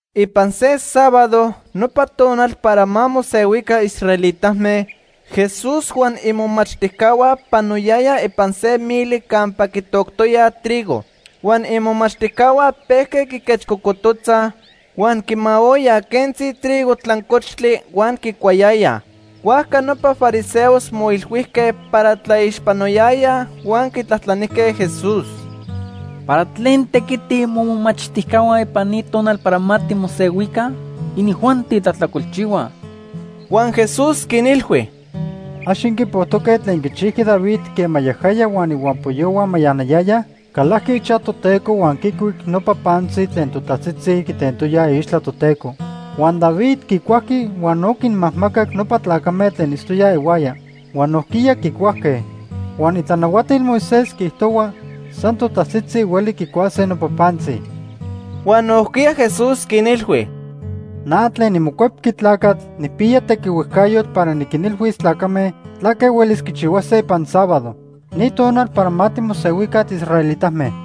Ipan se sábado, nopa tonal para ma mosehuica israelitame, Jesús huan imomachtijcahua panoyayaj ipan se mili campa quitoctoyaj trigo. Huan imomachtijcahua pejque quiquechcocototzaj, huan quimaoyaj quentzi trigo tlancochtli huan quicuayayaj. Huajca nopa fariseos moilhuijque para tlaixpanoyayaj huan quitlajtlanijque Jesús: ―¿Para tlen tequitij momomachtijcahua ipan ni tonal para ma timosehuica? Inijuanti tlajtlacolchihuaj. Huan Jesús quinilhui: ―¿Ax inquipojtoque tlen quichijqui David quema yajaya huan ihuampoyohua mayanayayaj? Calajqui ichaj Toteco huan quicuic nopa pantzi tlen totajtzitzi quitentoyaj iixtla Toteco. Huan David quicuajqui huan no quinmajmacac nopa tlacame tlen itztoyaj ihuaya. Huan nojquiya quicuajque. Huan itlanahuatil Moisés quiijtohua san totajtzitzi hueli quicuase nopa pantzi. Huan nojquiya Jesús quinilhui: ―Na tlen niMocuepqui Tlacatl nijpiya tequihuejcayotl para niquinilhuis tlacame tlaque huelis quichihuase ipan sábado, ni tonal para ma timosehuica tiisraelitame.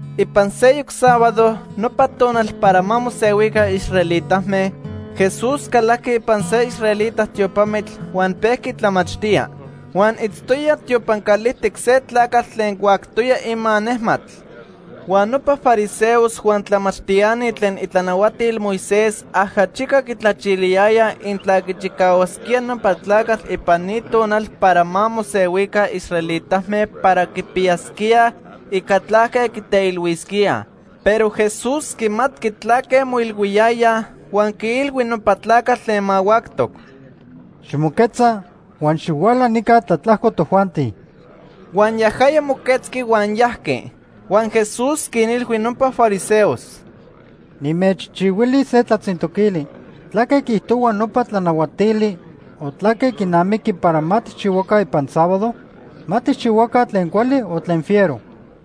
Ipan seyoc sábado, nopa tonal para ma mosehuica israelitame, Jesús calajqui ipan se israelita tiopamitl huan pejqui tlamachtía. Huan itztoya tiopan calijtic se tlacatl tlen huactoya ima nejmatl. Huan nopa fariseos huan tlamachtiani tlen itlanahuatil Moisés ajachica quitlachiliyayaj intla quichicahuasquía nopa tlacatl ipan ni tonal para ma mosehuica israelitame para quipiyasquíaj ica tlaque quiteilhuisquíaj. Pero Jesús quimatqui tlaque moilhuiyayaj huan quiilhui nopa tlacatl tlen mahuactoc: ―Ximoquetza huan xihuala nica tlatlajco tojuanti. Huan yajaya moquetzqui huan yajqui. Huan Jesús quinilhui nopa fariseos: ―Nimechchihuilis se tlatzintoquili: ¿Tlaque quiijtohuaj nopa tlanahuatili o tlaque quinamiqui para ma tijchihuaca ipan sábado? ¿Ma tijchihuaca tlen cuali o tlen fiero?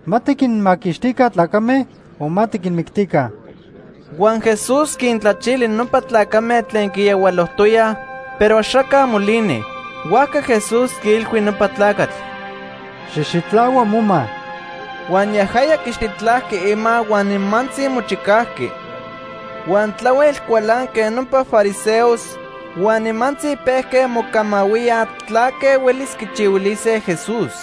¿Ma tiquinmaquixtica tlacame o ma tiquinmictica? Huan Jesús quintlachili nopa tlacame tlen quiyahualojtoyaj, pero axaca molini. Huajca Jesús quiilhui nopa tlacatl: ―Xijxitlahua moma. Huan yajaya quixitlajqui ima huan nimantzi mochicajqui. Huan tlahuel cualanque nopa fariseos huan nimantzi pejque mocamahuíaj tlaque huelis quichihuilise Jesús.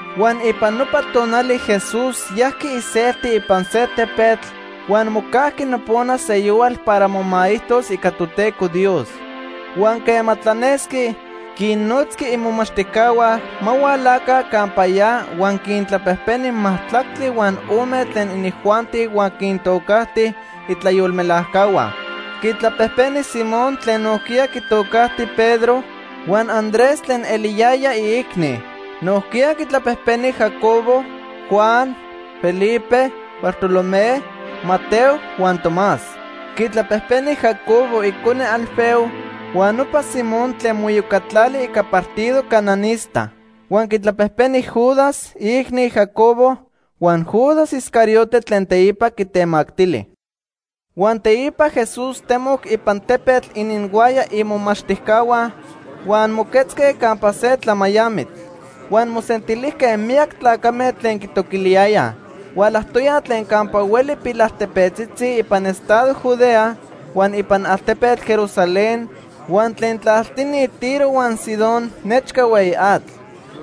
Huan ipan nopa tonali Jesús yajqui iselti ipan se tepetl huan mocajqui nopona seyohual para momaijtos ica Toteco Dios. Huan quema tlanesqui, quinnotzqui imomachtijcahua ma hualaca campa ya huan quintlapejpeni majtlactli huan ome tlen inijuanti huan quintocajti itlayolmelajcahua. Quitlapejpeni Simón tlen nojquiya quitocajti Pedro, huan Andrés tlen eliyaya iicni. Nojquiya quintlapejpeni Jacobo, Juan, Felipe, Bartolomé, Mateo huan Tomás. Quitlapejpeni Jacobo icone Alfeo huan nopa Simón tlen moiyocatlali ica partido cananista. Huan quitlapejpeni Judas, iicni Jacobo huan Judas Iscariote tlen teipa quitemactili. Huan teipa Jesús temoc ipan tepetl ininhuaya imomachtijcahua, huan moquetzque campa se tlamayamitl. Huan mosentilijque miyac tlacame tlen quitoquiliyayaj. Hualajtoyaj tlen campa hueli pilaltepetzitzi ipan estado Judea, huan ipan altepetl Jerusalén huan tlen tlaltini Tiro huan Sidón nechca hueyi atl.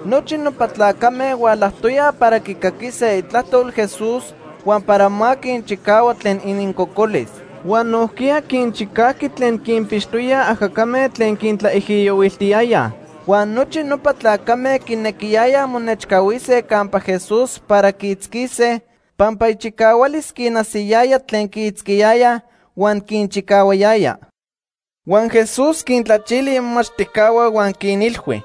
Nochi nopa tlacame hualajtoyaj para quicaquise itlajtol Jesús huan para ma quinchicahua tlen inincocolis. Huan nojquiya quinchicajqui tlen quinpixtoyaj ajacame tlen quintlaijiyohuiltiyayaj. Huan nochi nopa tlacame quinequiyayaj monechcahuise campa Jesús para quiitzquise, pampa ichicahualis quinajsiyaya tlen quiitzquiyayaj huan quinchicahuayaya. Huan Jesús quintlachili imomachtijcahua huan quinilhui: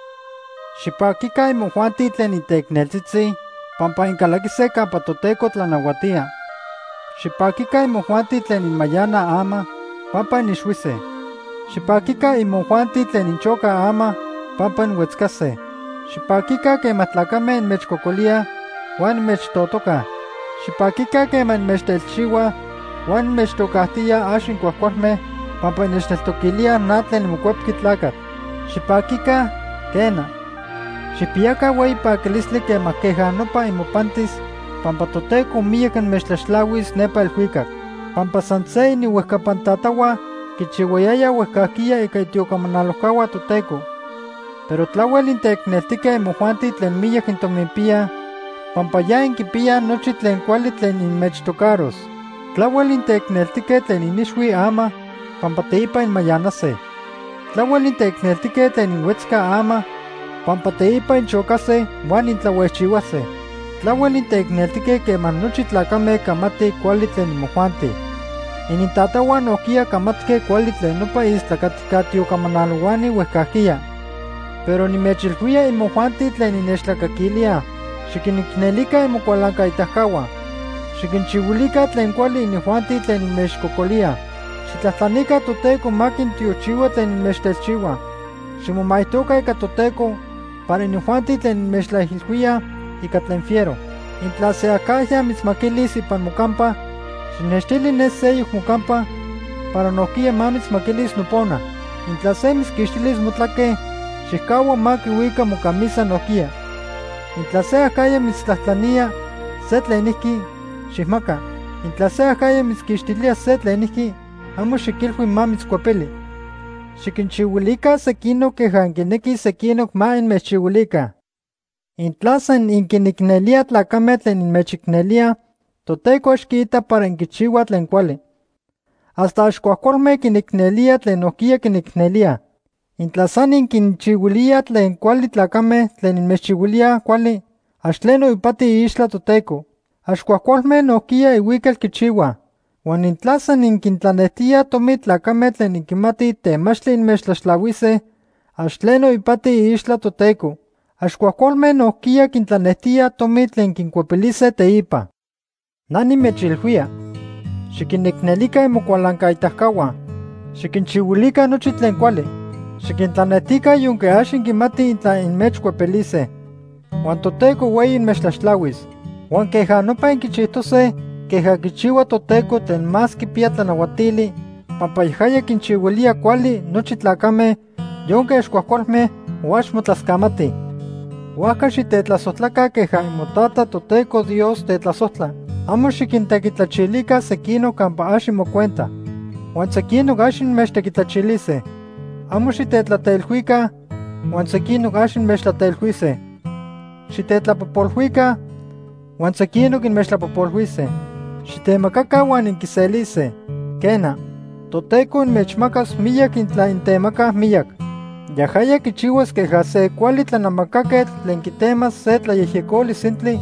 “Xipaquica imojuanti tlen inteicneltzitzi, pampa incalaquise campa Toteco tlanahuatía. Xipaquica imojuanti tlen inmayanaj ama, pampa inixhuise. Xipaquica imojuanti tlen inchocaj ama, pampa inhuetzcase. Xipaquica quema tlacame inmechcocolíaj huan inmechtotocaj. Xipaquica quema inmechtelchihuaj huan inmechtocajtíaj ax incuajcualme, pampa innechtoquilíaj na tlen niMocuepqui Tlacatl. Xipaquica, quena, xijpiyaca hueyi paquilistli quema queja nopa imopantis, pampa Toteco miyac inmechtlaxtlahuis nepa elhuicac. Pampa san se ininhuejcapan tatahua quichihuayayaj huejcajquiya ica itiocamanalojcahua Toteco. Pero tlahuel inteicneltique imojuanti tlen miyac intominpiyaj, pampa ya inquipiyaj nochi tlen cuali tlen inmechtocaros. Tlahuel inteicneltique tlen inixhuij ama, pampa teipa inmayanase. Tlahuel inteicneltique tlen inhuetzcaj ama, pampa teipa inchocase huan intlahuejchihuase. Tlahuel inteicneltique quema nochi tlacame camatij cuali tlen imojuanti. Inintatahua nojquiya camatque cuali tlen nopa istlacatica tiocamanalohuani huejcajquiya. “Pero nimechilhuía imojuanti tlen innechtlacaquilíaj: Xiquinicnelica imocualancaitacahua. Xiquinchihuilica tlen cuali inijuanti tlen inmechcocolíaj. Xijtlajtlanica Toteco ma quintiochihua tlen inmechtelchihuaj. Ximomaijtoca ica Toteco para inijuanti tlen inmechtlaijilhuíaj ica tlen fiero. Intla se acajya mitzmaquilis ipan mocampa, xijnextili ne seyoc mocampa para nojquiya ma mitzmaquilis nopona. Intla se mitzquixtilis motlaque, xijcahua ma quihuica mocamisa nojquiya. Intla se acajya mitztlajtlanía se tlenijqui, xijmaca. Intla se acajya mitzquixtilía se tlenijqui, amo xiquilhui ma mitzcuepili. Xiquinchihuilica sequinoc queja inquinequij sequinoc ma inmechchihuilica. “Intla san inquinicnelíaj tlacame tlen inmechicnelíaj, Toteco ax quiita para inquichihuaj tlen cuali. Hasta ax cuajcualme quinicnelíaj tlen nojquiya quinicnelíaj. Intla san inquinchihuilíaj tlen cuali tlacame tlen inmechchihuilíaj cuali, ax tleno ipati iixtla Toteco. Ax cuajcualme nojquiya ihuical quichihuaj. Huan intla san inquintlanejtíaj tomi tlacame tlen inquimatij temachtli inmechtlaxtlahuise, ax tleno ipati iixtla Toteco. Ax cuajcualme nojquiya quintlanejtíaj tomi tlen quincuepilise teipa. Na nimechilhuía, xiquinicnelica imocualancaitacahua. Xiquinchihuilica nochi tlen cuali. Xiquintlanejtica yonque ax inquimatij intla inmechcuepilise. Huan Toteco hueyi inmechtlaxtlahuis. Huan queja nopa inquichijtose queja quichihua Toteco Tlen Más Quipiya Tlanahuatili pampa yajaya quinchihuilía cuali nochi tlacame, yonque ax cuajcualme o ax motlascamatij. Huajca xitetlasojtlaca queja imoTata, Toteco Dios, tetlasojtla. “Amo xiquintequitlachilica sequinoc campa ax imocuenta, huan sequinoc ax inmechtequitlachilise. Amo xitetlateilhuica, huan sequinoc ax inmechtlateilhuise. Xitetlapojpolhuica, huan sequinoc inmechtlapojpolhuise. Xitemacaca huan inquiselise. Quena, Toteco inmechmacas miyac intla intemacaj miyac. Yajaya quichihuas queja se cuali tlanamacaquetl tlen quitemas se tlayejyecoli sintli,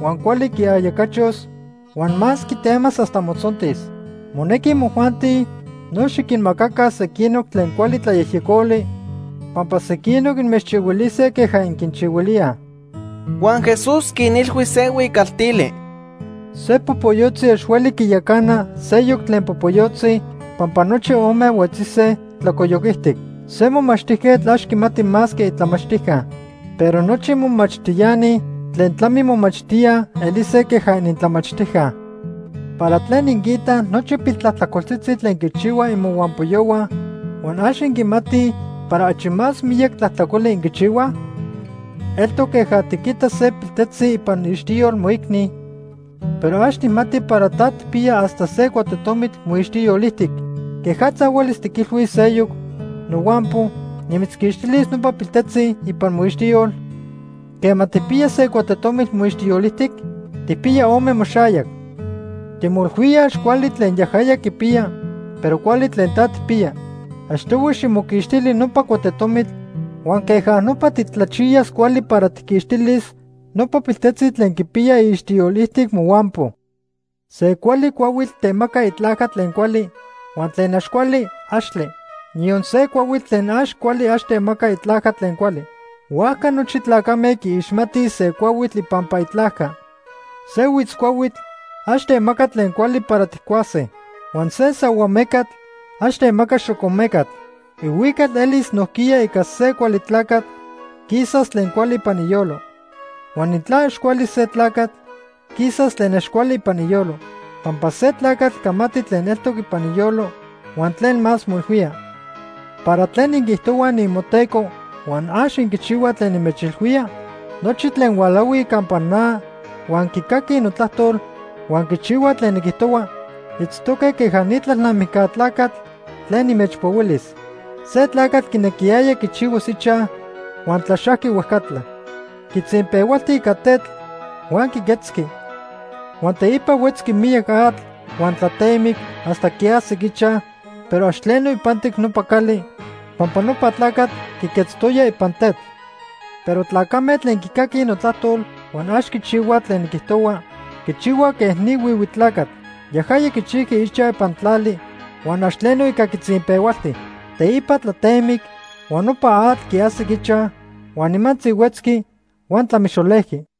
huan cuali quiayacachos, huan más quitemas hasta motzontis. Monequi imojuanti no xiquinmacaca sequinoc tlen cuali tlayejyecoli, pampa sequinoc inmechchihuilise queja inquinchihuilíaj.” Huan Jesús quinilhui se huicaltili: “Se popoyotzi ax hueli quiyacana seyoc tlen popoyotzi pampa nochi ome huetzise tlacoyoc ijtic. Se momachtijquetl ax quimati más que itlamachtijca, pero nochi momachtiani tlen tlamimomachtíaj elise queja inintlamachtijca. “¿Para tlen inquiitaj nochi piltlajtlacoltzitzi tlen quichihuaj imohuampoyohua huan ax inquimatij para achi más miyac tlajtlacoli inquichihuaj? Eltoc queja tiquita se piltejtzi ipan iixtiyol moicni, pero ax tijmati para ta tijpiya hasta se cuatetomitl moixtiyol ijtic. ¿Quejatza huelis tiquilhuis seyoc: ‘Nohuampo, nimitzquixtilis nopa piltejtzi ipan moixtiyol’, quema tijpiya se cuatetomitl moixtiyol ijtic? Tijpiya ome moxayac. Timoilhuía ax cuali tlen yajaya quipiya, pero cuali tlen ta tijpiya. Achtohui ximoquixtili nopa cuatetomitl, huan queja nopa titlachiyas cuali para tijquixtilis nopa piltejtzi tlen quipiya iixtiyol ijtic mohuampo. “Se cuali cuahuitl temaca itlajca tlen cuali, huan tlen ax cuali, axtle. Niyon se cuahuitl tlen ax cuali ax temaca itlajca tlen cuali. Huajca nochi tlacame quiixmatij se cuahuitl ipampa itlajca. Se huitzcuahuitl ax temaca tlen cuali para tijcuase. Huan se sahuamecatl ax temaca xocomecatl. Ihuical elis nojquiya ica se cuali tlacatl, quisas tlen cuali ipan iyolo. Huan intla ax cuali se tlacatl, quisas tlen ax cuali ipan iyolo. Pampa se tlacatl camati tlen eltoc ipan iyolo huan tlen más moilhuía. “¿Para tlen inquiijtohuaj niimoTeco huan ax inquichihuaj tlen nimechilhuía? Nochi tlen hualahuij campa na huan quicaquij notlajtol huan quichihuaj tlen niquijtohua, itztoque queja ni tlalnamijca tlacatl tlen nimechpohuilis. Se tlacatl quinequiyaya quichihuas ichaj huan tlaxajqui huejcatla. Quitzinpehualti ica tetl huan quiquetzqui. Huan teipa huetzqui miyac atl huan tlatemic hasta quiajsic ichaj, pero ax tleno ipantic nopa cali pampa nopa tlacatl quiquetztoya ipan tetl. Pero tlacame tlen quicaquij notlajtol huan ax quichihuaj tlen niquijtohua, quichihuaj quej ni huihui tlacatl. Yajaya quichijqui ichaj ipan tlali huan ax tleno ica quitzinpehualti. Teipa tlatemic, huan nopa atl quiajsic ichaj, huan nimantzi huetzqui huan tlamixolejqui.”